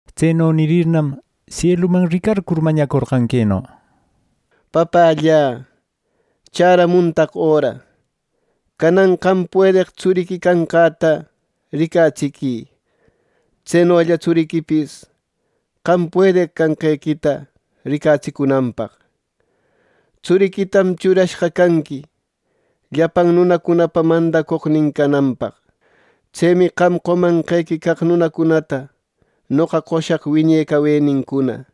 Tseno nirirnam, sieluman ricarcur mañacorqan queno: “Papällä, ¡chäramuntaq öra! Canan qam puedeq Tsuriqui canqäta ricatsiquï, tsenolla Tsuriquipis qam puedeq canqequita ricatsicunanpaq. Tsuriquitam churashqa canqui llapan nunacunapa mandacoqnin cananpaq. Tsemi qam qomanqequi caq nunacunata noqa qoshaq wiñe cawenincuna.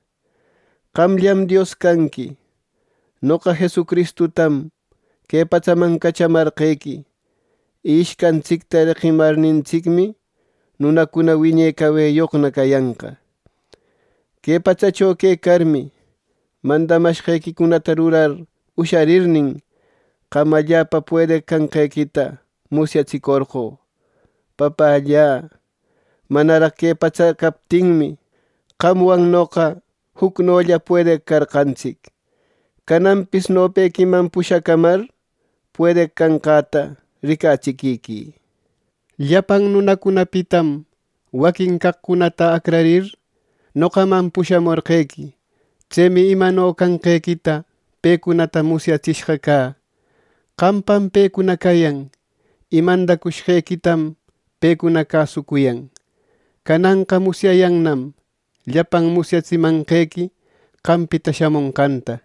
Qamllam Dios canqui. Noqa Jesucristutam que patsaman cachamarqequi. Y ishcantsicta reqimarnintsicmi, nunacuna wiñe caweyoqna cayanqa. “Que patsacho quecarmi, mandamashqequicunata rurar usharirnin, qam allapa puedeq canqequita musyatsicorqö. Papällä, manaraq que patsa captinmi, qamwan noqa jucnolla puedeq carqantsic. Cananpis nopequiman pushacamar puedeq canqäta ricatsiquiquï. “Llapan nunacunapitam waquin caqcunata acrarir, noqaman pushamorqequi. Tsemi imano canqequita pecunata musyatsishqa cä. Qampam pecuna cayan, y mandacushqequitam pecuna cäsucuyan. Cananqa musyayannam llapan musyatsimanqequi qampita shamonqanta.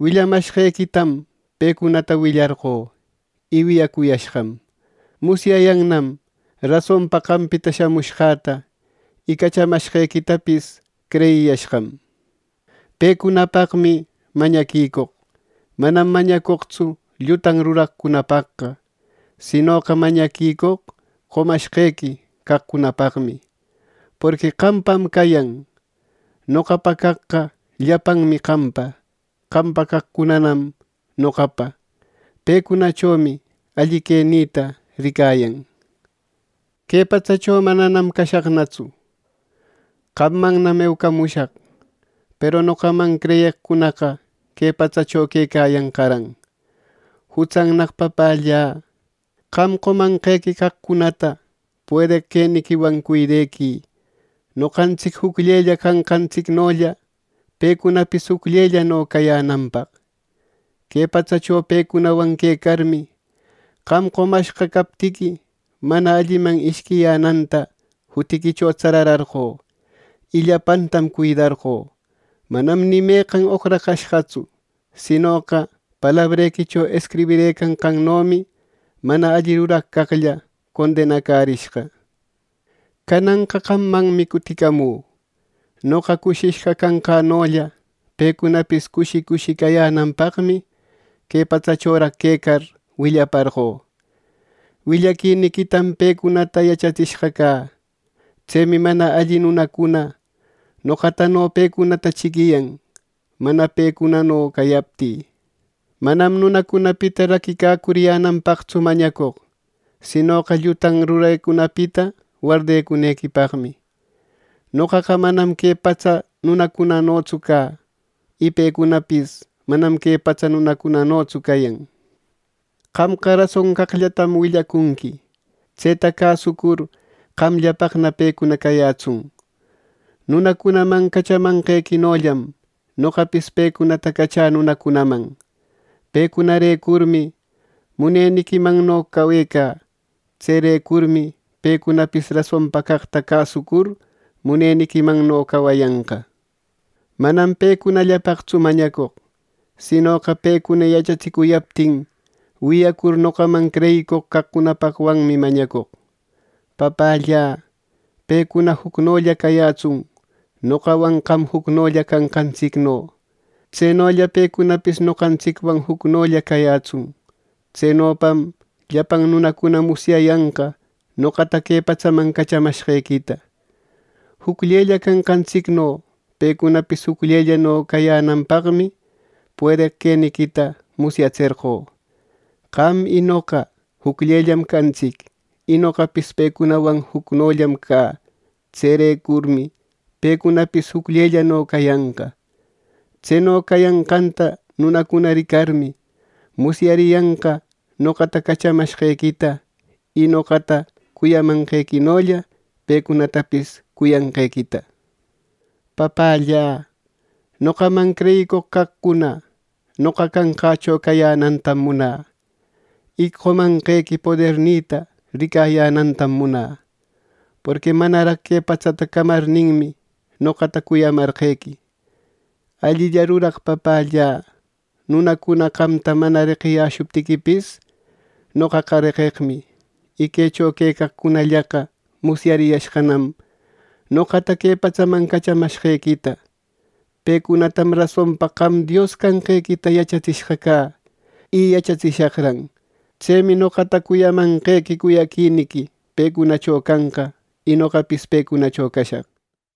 Willamashqequitam pecunata willarqö, y wiyacuyashqam. Musyayannam rasonpa qampita shamushqäta, y cachamashqequitapis creyiyashqam. “Pecunapaqmi mañaquicoq. Manam mañacoqtsu llutan ruraqcunapaqqa, sinoqa mañaquicoq qomashquequi caqcunapaqmi, porqui qampam cayan. Noqapa caqqa llapanmi qampa. Qampa caqcunanam noqapa. Pecunachomi alli quenïta ricayan. “Que patsacho mananam cashaqnatsu. Qammannam eucamushaq. Peru noqaman creyeqcunaqa que patsacho quecayanqaran. Jutsannaq Papällä, qam qomanqequi caqcunata puedeq queniquiwan cuidequï noqantsic jucllella canqantsicnolla pecunapis jucllellano cayänanpaq. Que patsacho pecunawan quecarmi, qam qomashqa captiqui, mana alliman ishquiyänanta jutiquicho tsararqö, y llapantam cuidarqö. Manam ni meqan oqracashqatsu. Sinoqa palabrequicho escribishqannomi mana alli ruraq caqlla condenacärishqa. “Cananqa qammanmi cuticamü. Noqa cushishqa canqänolla pecunapis cushi cushi cayänanpaqmi que patsachoraq quecar willaparqö. Willaquiniquitam pecunata yachatsishqa cä. Tsemi mana alli nunacuna noqatano pecunata chiquiyan, mana pecunano cayaptï. Manam nunacunapita raquicacuriyänanpaqtsu mañacoq, sinoqa llutan rurecunapita wardecunequipaq. Noqaqa manam que patsa nunacunanotsu cä. Y pecunapis manam que patsa nunacunanotsu cayan. Qamqa rason caqllatam willacunqui. Tseta cäsucur qamllapaqna pecuna cayätsun. Nunacunaman cachamanqequinollam noqapis pecunata cachä nunacunaman. Pecunarecurmi muneniquimanno cawecä. Tserecurmi pecunapis rasonpa caqta cäsucur, muneniquimanno cawayanqa. “Manam pecunallapaqtsu mañacoq. Sinoqa pecuna yachatsicuyaptin wiyacur noqaman creyicoq caqcunapaqwanmi mañacoq. Papällä, pecuna jucnolla cayätsun, noqawan qam jucnolla canqantsicno. Tsenolla pecunapis noqantsicwan jucnolla cayätsun. Tsenopam llapan nunacuna musyayanqa noqata que patsaman cachamashqequita. Jucllella canqantsicno pecunapis jucllellano cayänanpaqmi puedeq queniquita musyatserqö. Qam y noqa jucllellam cantsic, y noqapis pecunawan jucnollam cä. Tserecurmi pecunapis jucllellano cayanqa. Tseno cayanqanta nunacuna ricarmi, musyariyanqa noqata cachamashqequita y noqata cuyamanqequinolla pecunatapis cuyanqequita. “Papällä, noqaman creyicoq caqcuna noqa canqächo cayänantam munä, y qomanqequi podernïta ricayänantam munä; porqui manaraq que patsata camarninmi, noqata cuyamarqequi. Allilla ruraq Papällä, nunacuna qamta mana reqiyäshuptiquipis, noqaqa reqeqmi. Y quecho quecaqcunallaqa musyariyashqanam noqata que patsaman cachamashqequita. Pecunatam rasonpa qam Dios canqequita yachatsishqa cä, y yachatsishaqran. Tsemi noqata cuyamanqequi cuyaquiniqui pecunacho canqa, y noqapis pecunacho cashaq” nir.